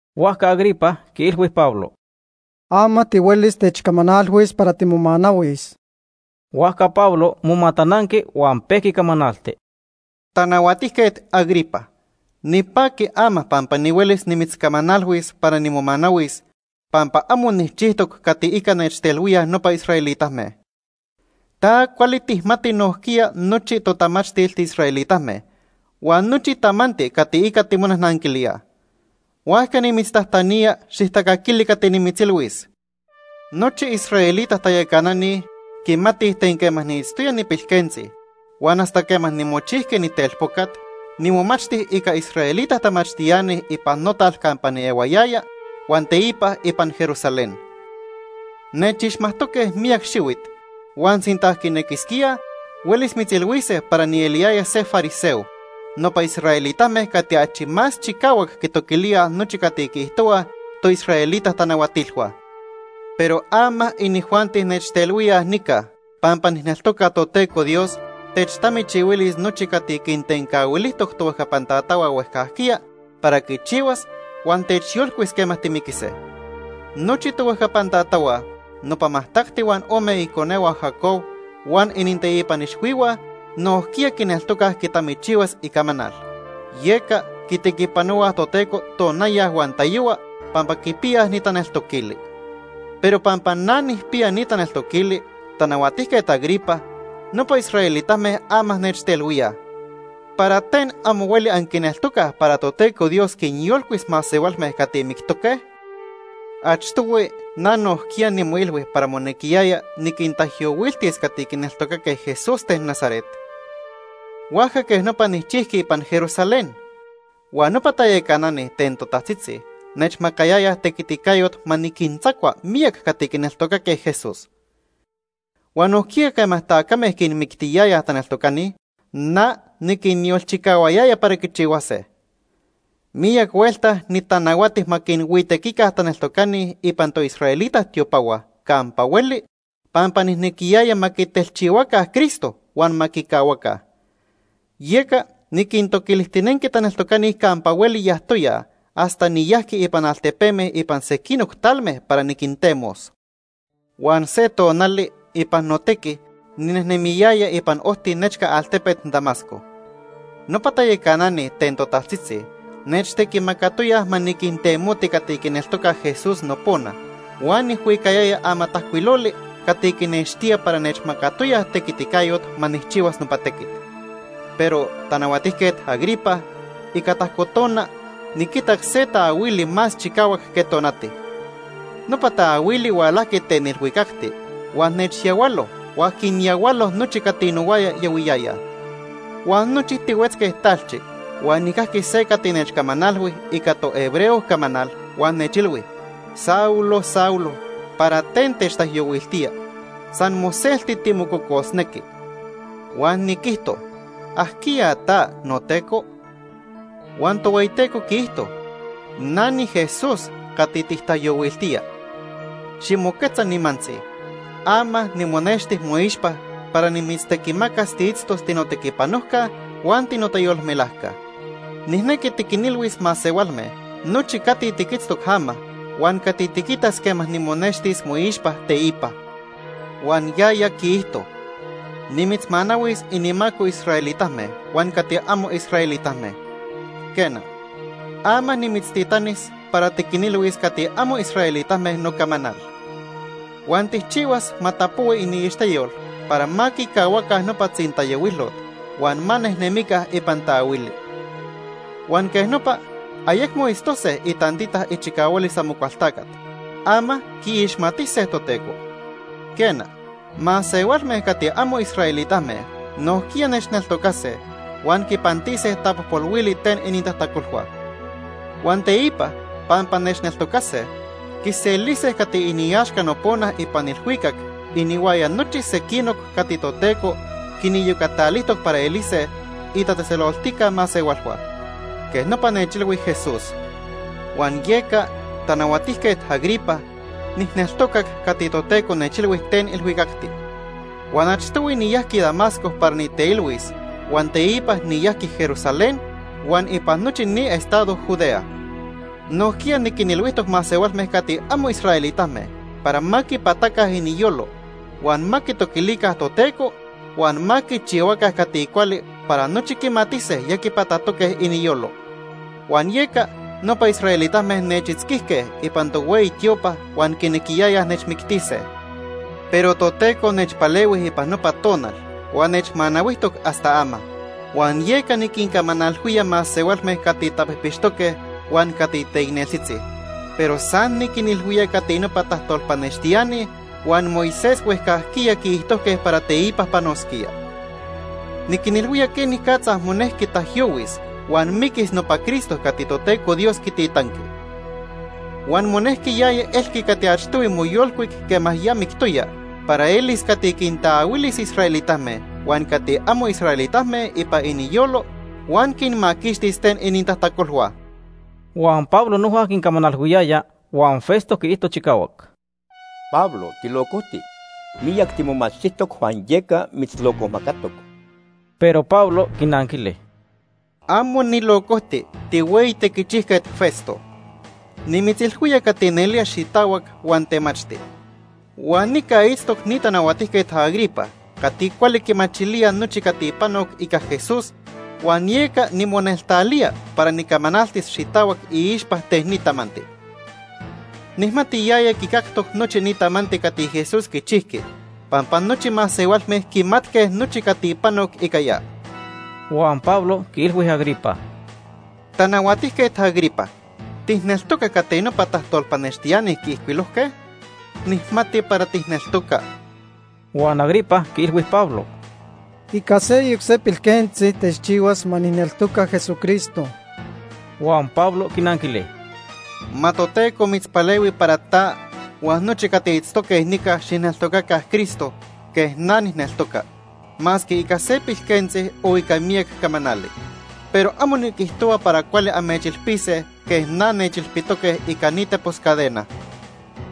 Huajca Agripa quiilhui Pablo: ―Ama tihuelis techcamanalhuis para timomanahuis. Huajca Pablo momatananqui huan pejqui camanalti: “Tanahuatijquet Agripa, nipaqui ama pampa nihuelis nimitzcamanalhuis para nimomanahuis, pampa amo nijchijtoc cati ica nechtelhuíaj nopa israelitame. Ta cuali tijmati nojquiya nochi totamachtil tiisraelitame huan nochi tamanti cati ica timonajnanquilíaj. Huajca nimitztajtanía xijtacaquili cati nimitzilhuis. “Nochi israelita tayacanani quimatij ten quema niitztoya nipilquentzi huan hasta quema nimochijqui nitelpocat, nimomachti ica israelita tamachtiani ipan notal campa niehuayaya huan teipa ipan Jerusalén. Nechixmajtoque miyac xihuit huan sinta quinequisquíaj, huelis mitzilhuise para nieliyaya se fariseo, nopa israelitame cati achi más chicahuac quitoquilíaj nochi cati quiijtohuaj toisraelita tanahuatilhua. Pero ama inijuanti nechtelhuíaj nica pampa nijneltoca Toteco Dios techtamichihuilis nochi cati quintencahuilijtoc tohuejcapan tatahua huejcajquiya para quichihuas huan techyolcuis quema timiquise. Nochi tohuejcapan tatahua, nopa majtacti huan ome iconehua Jacob, huan ininteipan ixhuihua nojquiya quineltocaj quitamichihuas icamanal, yeca quitequipanohuaj Toteco tonaya huan tayohua pampa quipiyaj ni taneltoquili. Pero pampa na nijpiya ni taneltoquili, Tanahuajtiquet Agripa, nopa israelitame ama nechtelhuíaj. ¿Para ten amo hueli anquineltocaj para Toteco Dios quinyolcuis masehualme cati mictoque? “Achtohui na nojquiya nimoilhui para monequiyaya niquintaijyohuiltis cati quineltocaque Jesús ten Nazaret. Huajca quej nopa nijchijqui ipan Jerusalén. Huan nopa tayacanani ten totajtzitzi nechmacayayaj tequiticayot ma niquintzacua miyac cati quineltocaque Jesús. Huan nojquiya quema tacame quinmictiyayaj taneltocani, na niquinyolchicahuayaya para quichihuase. Miyac huelta nitanahuati ma quinhuitequica taneltocani ipan toisraelita tiopahua campa hueli pampa nijnequiyaya ma quitelchihuaca Cristo huan ma quicahuaca. Yeca niquintoquilijtinenqui taneltocani campa hueli yajtoyaj hasta niyajqui ipan altepeme ipan sequinoc talme para niquintemos. “Huan se tonali ipan notequi ninejnemiyaya ipan ojti nechca altepet Damasco. Nopa tayacanani ten totajtzitzi nechtequimacatoyaj ma niquintemoti cati quineltocaj Jesús nopona huan nijhuicayaya amatajcuiloli cati quinextía para nechmacatoyaj tequiticayot ma nijchihuas nopa tequit. Pero, Tanahuatijquet Agripa, ica tajco tona niquitac se taahuili más chicahuac que tonati. Nopa taahuili hualajqui ten ilhuicacti huan nechyahualo huan quinyahualo nochi cati nohuaya yahuiyayaj. Huan nochi tihuetzque talchi huan nijcajqui se cati nechcamanalhui ica tohebreo camanal huan nechilhui: ‘Saulo, Saulo, ¿para ten techtaijyohuiltía? San moselti timococosnequi.’ “Huan niquijto: ‘¿Ajquiya ta, noTeco?’ “Huan Tohueyiteco quiijto: ‘Na niJesús cati tijtaijyohuiltía. Ximoquetza nimantzi. Ama nimonexti moixpa para nimitztequimacas tiitztos tinotequipanojca huan tinotayolmelajca. Nijnequi tiquinilhuis masehualme nochi cati tiquitztoc ama huan cati tiquitas quema nimonextis moixpa teipa.’ “Huan yaya quiijto: ‘Nimitzmanahuis inimaco israelitame huan cati amo israelitame. Quena, ama nimitztitanis para tiquinilhuis cati amo israelitame nocamanal. Huan tijchihuas ma tapohui iniixteyol para ma quicahuaca nopa tzintayohuilot huan ma nejnemica ipan taahuili. Huan quej nopa ayecmo itztose itantita ichicahualis Amocualtacat, ama quiixmatise Toteco. Quena, masehualme cati amo israelitame nojquiya nechneltocase huan quipantise tapojpolhuili ten inintajtacolhua. Huan teipa pampa nechneltocase, quiselise cati iniaxca nopona ipan ilhuicac inihuaya nochi sequinoc cati Toteco quiniyocatalijtoc para elise itatzejtzeloltica masehualhua.’ Quej nopa nechilhui Jesús. “Huan yeca, Tanahuatijquet Agripa, nijneltocac cati Toteco nechilhui ten ilhuicacti. Huan achtohui niyajqui Damasco para niteilhuis huan teipa niyajqui Jerusalén huan ipan nochi ni estado Judea. Nojquiya niquinilhuijtoc masehualme cati amo israelitame para ma quipataca iniyolo, huan ma quitoquilica Toteco huan ma quichihuaca cati cuali para nochi quimatise ya quipatatoque iniyolo. Huan yeca nopa israelitame nechitzquijque ipan tohueyi tiopa huan quinequiyayaj nechmictise. Pero Toteco nechpalehui ipan nopa tonal huan nechmanahuijtoc hasta ama, huan yeca niquincamanalhuía masehualme cati tapijpixtoque huan cati teicneltzitzi, pero san niquinilhuía cati nopa tajtolpanextiani huan Moisés huejcajquiya quiijtojque para teipa panosquía. Niquinilhuía quenicatza monejqui taijyohuis huan miquis nopa Cristo cati Toteco Dios quititanqui. Huan monejqui yaya elqui cati achtohui moyolcuic quema ya mictoya para elis cati quintaahuilis israelitame huan cati amo israelitame ipan iniyolo huan quinmaquixtis ten inintajtacolhua.” Huan Pablo noja quincamanalhuiyaya, huan Festo quiijto chicahuac: ―¡Pablo tilocojti! Miyac timomachtijtoc huan yeca mitzlocojmacatoc. Pero Pablo quinanquili: ―Amo nilocojti, tihueyi tequichijquet Festo. Nimitzilhuía cati nelía xitahuac huan temachti. Huan nica itztoc ni Tanahuatijquet Agripa cati cuali quimachilía nochi cati panoc ica Jesús huan yeca nimoneltalía para nicamanaltis xitahuac iixpa ten ni tamanti. Nijmati yaya quicactoc nochi ni tamanti cati Jesús quichijqui pampa nochi masehualme quimatque nochi cati panoc ica ya. Huan Pablo quiilhui Agripa: ―Tanahuatijquet Agripa, ¿tijneltoca cati nopa tajtolpanextiani quiijcuilojque? Nijmati para tijneltoca. Huan Agripa quiilhui Pablo: ―Ica seyoc se pilquentzi techchihuas ma nijneltoca Jesucristo. Huan Pablo quinanquili: ―Ma Toteco mitzpalehui para ta huan nochi cati itztoque nica xijneltocaca Cristo quej na nijneltoca masque ica se pilquentzi o ica miyac camanali. Pero amo niquijtohua para cuali amechilpise quej na nechilpitoque ica ni tepos cadena.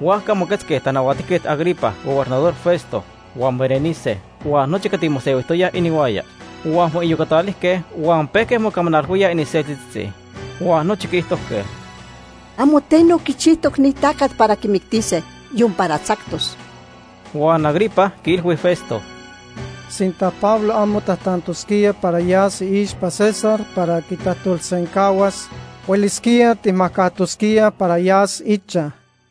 Huajca moquetzque Tanahuatijquet Agripa, Gobernador Festo, huan Berenice huan nochi cati mosehuijtoyaj inihuaya. Huan moiyocatalijque huan pejque mocamanalhuíaj iniseltitzitzi. Huan nochi quiijtojque: ―Amo teno quichijtoc ni tacat para quimictise, yon para tzactos. Huan Agripa quiilhui Festo: ―Sinta Pablo amo tajtantosquía para yas iixpa César para quitajtolsencahuas, huelisquía tijmajcajtosquíaj para yas ichaj.